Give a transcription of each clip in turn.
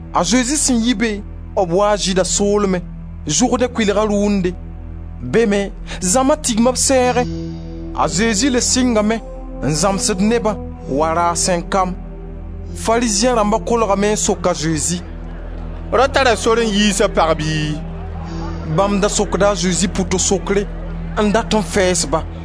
A Zezi sẽn yi be, b waa Zɩɩda soolmẽ, Zʋrdẽ kʋɩlga rʋʋnde. Be me, zãma tigma b sɛɛgẽ. A Zezi le sɩngame n zãmsd nebã wa rasem kam. Farizẽ rãmba kolgame n sok a Zezi: «Rao tara sor n yiis a pag bɩ?» Bãmb da sokda a Zezi pʋto-sokre n dat n fɛɛs-ba.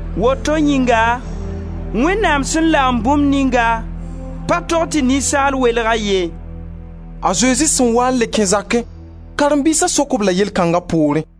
Woto yĩnga, Wẽnnaam sẽn lagem bũmb ninga, pa tog tɩ ninsaal welg-a ye.» A Zezi sẽn waa n le kẽ zakẽ, karen-biisa sok-b-la yell kãnga poorẽ.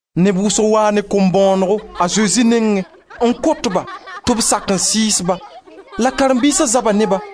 Neb wʋsg waa ne b kom-bõonego a Zezi nengẽ n kot-ba tɩ b sak n sɩɩs-ba. La karen-biisa zaba ne-ba.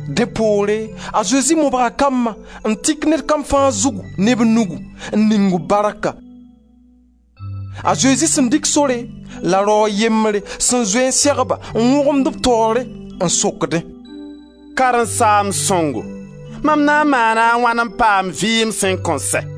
Dẽ poore, a Zezi mobga kambã, n tik ned kam fãa zug ne b nugu, n ning-b barka. A Zezi sẽn dɩk sore, la rao a yembre sẽn zoe n seg-ba n wõgemd b taoore, n sokdẽ: «Karen-saamb sõngo, mam na n maana a wãn n paam vɩɩm sẽn kõn sɛ?»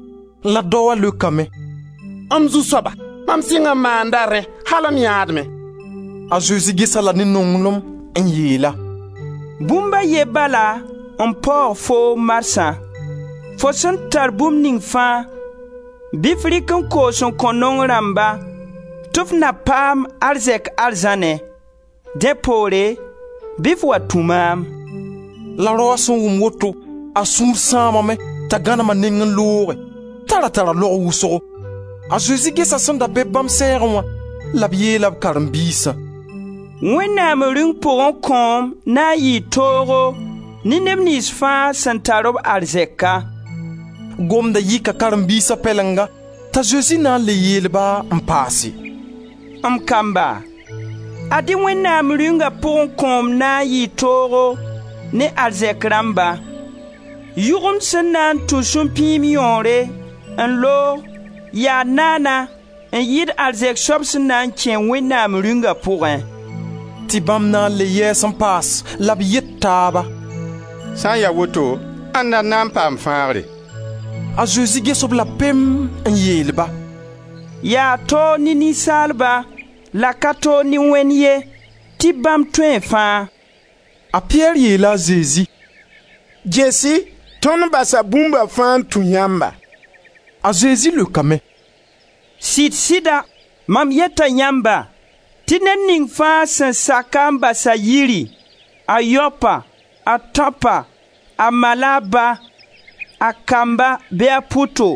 La daoã leokame: «M zu-soaba, mam sɩng n maanda rẽ al m yãadmẽ.» A Zezi ges-a-la ne nonglem, n yeel-a: «Bũmb a ye bala n paoog foo marsã: fo sẽn tar bũmb ning fãa, bɩ f rɩk n koos n kõ naong rãmba tɩ f na paam arzɛk arzãnẽ. Dẽ poore, bɩ f wa tũ maam.» La raoã sẽn wʋm woto, a sũur sãamame t'a gãnem a neng n looge t'a ra tara laog wʋsgo. A Zezi gesa sẽn da be-b bãmb sɛɛgẽ wã la b yeela b karen-biisã: «Wẽnnaam Rĩung pugẽ kõom na n yɩɩ toogo ne neb niyns fãa sẽn tar-b arzɛka!» Gomda yɩka karen-biisa pɛlenga t'a Zezi na n le yeel-ba, n paase: «M kamba, ad-y Wẽnnaam Rĩunga pugẽ kõom na n yɩɩ toogo ne arzɛk rãmba! Yʋgemd sẽn na n tũ supĩim yõore n loog yaa naana n yɩɩd arzɛk soab sẽn na n kẽ Wẽnnaam Rĩungã pugẽ.» Tɩ bãmb na n le yɛɛs n paas la b yet taaba: «Sã n ya woto, ãnda n na n paam fãagre?» A Zezi ges-b-la pem, n yeel-ba: «Yaa toog ne ninsaalba, la ka toog ne Wẽnd ye tɩ bãmb tõee fãa.» A Piyɛr yeela a Zezi: «Ges-y, tõnd basa bũmba fãa n tũ yãmba.» A Zezi leokame: «Sɩd-sɩda, mam yeta yãmba, tɩ ned ning fãa sẽn sak-a n bas a yiri, a yaopa, a tãopa, a ma la a ba, a kamba bɩ a pʋto,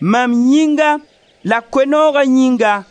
mam yĩnga la Koe-nooga yĩnga,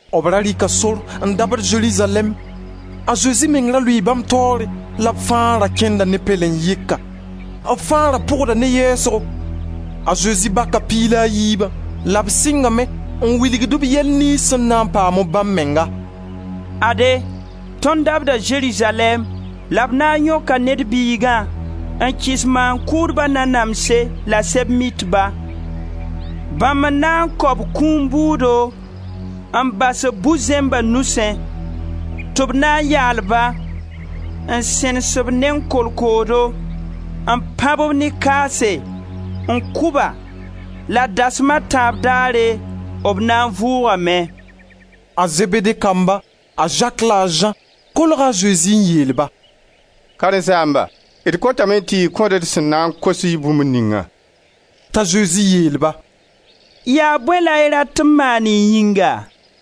B ra rɩka sor n dabd Zerizalɛɛm. A Zezi meng ra lʋɩɩ bãmb taoore la b fãa ra kẽnda ne pɛlen-yɩka, b fãa ra pʋgda ne yɛɛsgo. A Zezi baka Piig la a yiibã la b sɩngame n wilgd-b yɛl niyns sẽn na n paam bãmb menga: «Ade, tõnd dabda Zerizalɛɛm la b na n yõka Ned Biigã n kɩs maan-kʋʋdba nanamse la Sɛb-mitba; bãmb n na n kao b kũum bʋʋdo, n bas-b bu-zẽmba nusẽ, tɩ b na n yaal-ba, n sẽnes b neng kolkoodo, n pãb-b ne kaase, n kʋ-ba, la dasma a tãab poore, b na n vʋʋgame.» A Zebede kamba, a Zak la a Zã, kolga a Zezi n yeel-ba: «Karen-saamba, d kotame tɩ y kõ-d d sẽn na n kos-y bũmb ningã.» T'a Zezi yeel-ba: «Yaa bõe la y rat tɩ m maan y yĩnga!»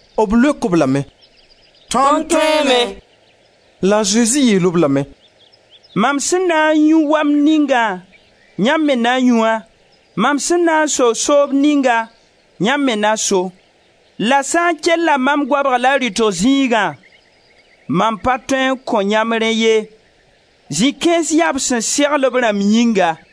B leok-b lame: «Tõnd tõeeme.» La a Zezi yeel-b lame: «Mam sẽn na n yũ wamd ningã yãmb me na yũ-a. Mam sẽn na n so soob ninga, yãmb me na so. La sã n kella mam goabg la rɩtg zĩigã, mam pa tõe n kõ yãmb rẽ ye. Zĩ-kãens yaa b sẽn segl b rãmb yĩnga.»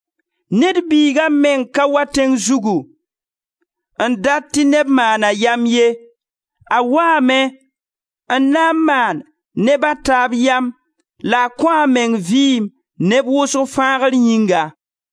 Ned Biiga meng ka wa tẽng zugu n dat tɩ neb maana a yam ye; a waame n na n maan neb a taab yam, la a kõ a meng vɩɩm neb wʋsg fãagr yĩnga.»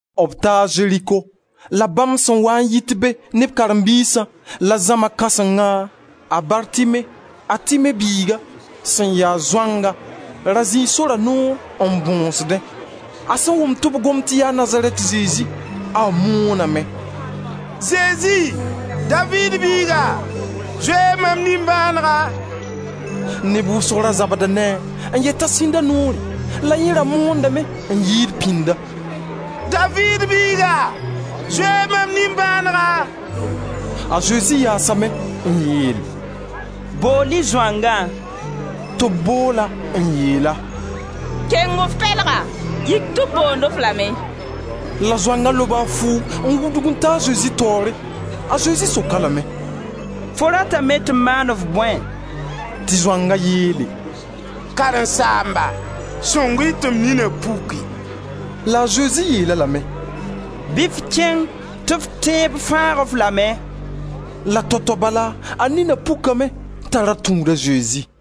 B taa Zeriko. La bãmb sẽn waa n yit be ne b karen-biisã la zãma kãsengã, a Bartime, a Time biiga, sẽn ya zoanga, ra zĩi sora noor n bõsdẽ. A sẽn wʋm tɩ b gomd tɩ yaa Nazarɛt Zezi, a mooname: «Zezi, Daviid biiga, zoe-y mam nimbãanega.» Neb wʋsg da zabda ne-a, n yet t'a sĩnd a noore. La yẽ da moondame n yɩɩd pĩnda: «Daviid biiga, zoe-y mam nimbãanega.» A Zezi yaasame n yeel: «Bool-y zoangã!» Tɩ b bool-a n yeel-a: «Keng f pɛlga, yik tɩ b boond-f lame.» La zoanga loba a fuug n wudg n ta a Zezi taoore. A Zezi sok-a lame: «Fo ratame tɩ m maan-f bõe?» Tɩ zoanga yeele: «Karen-saamba, sõng-y tɩ m nina puki!» La a Zezi yeel-a lame: «Bɩ f kẽng tɩ f tẽeb fãag-f lame.» La tao-tao bala, a nina pukame, t'a ra tũud a Zezi.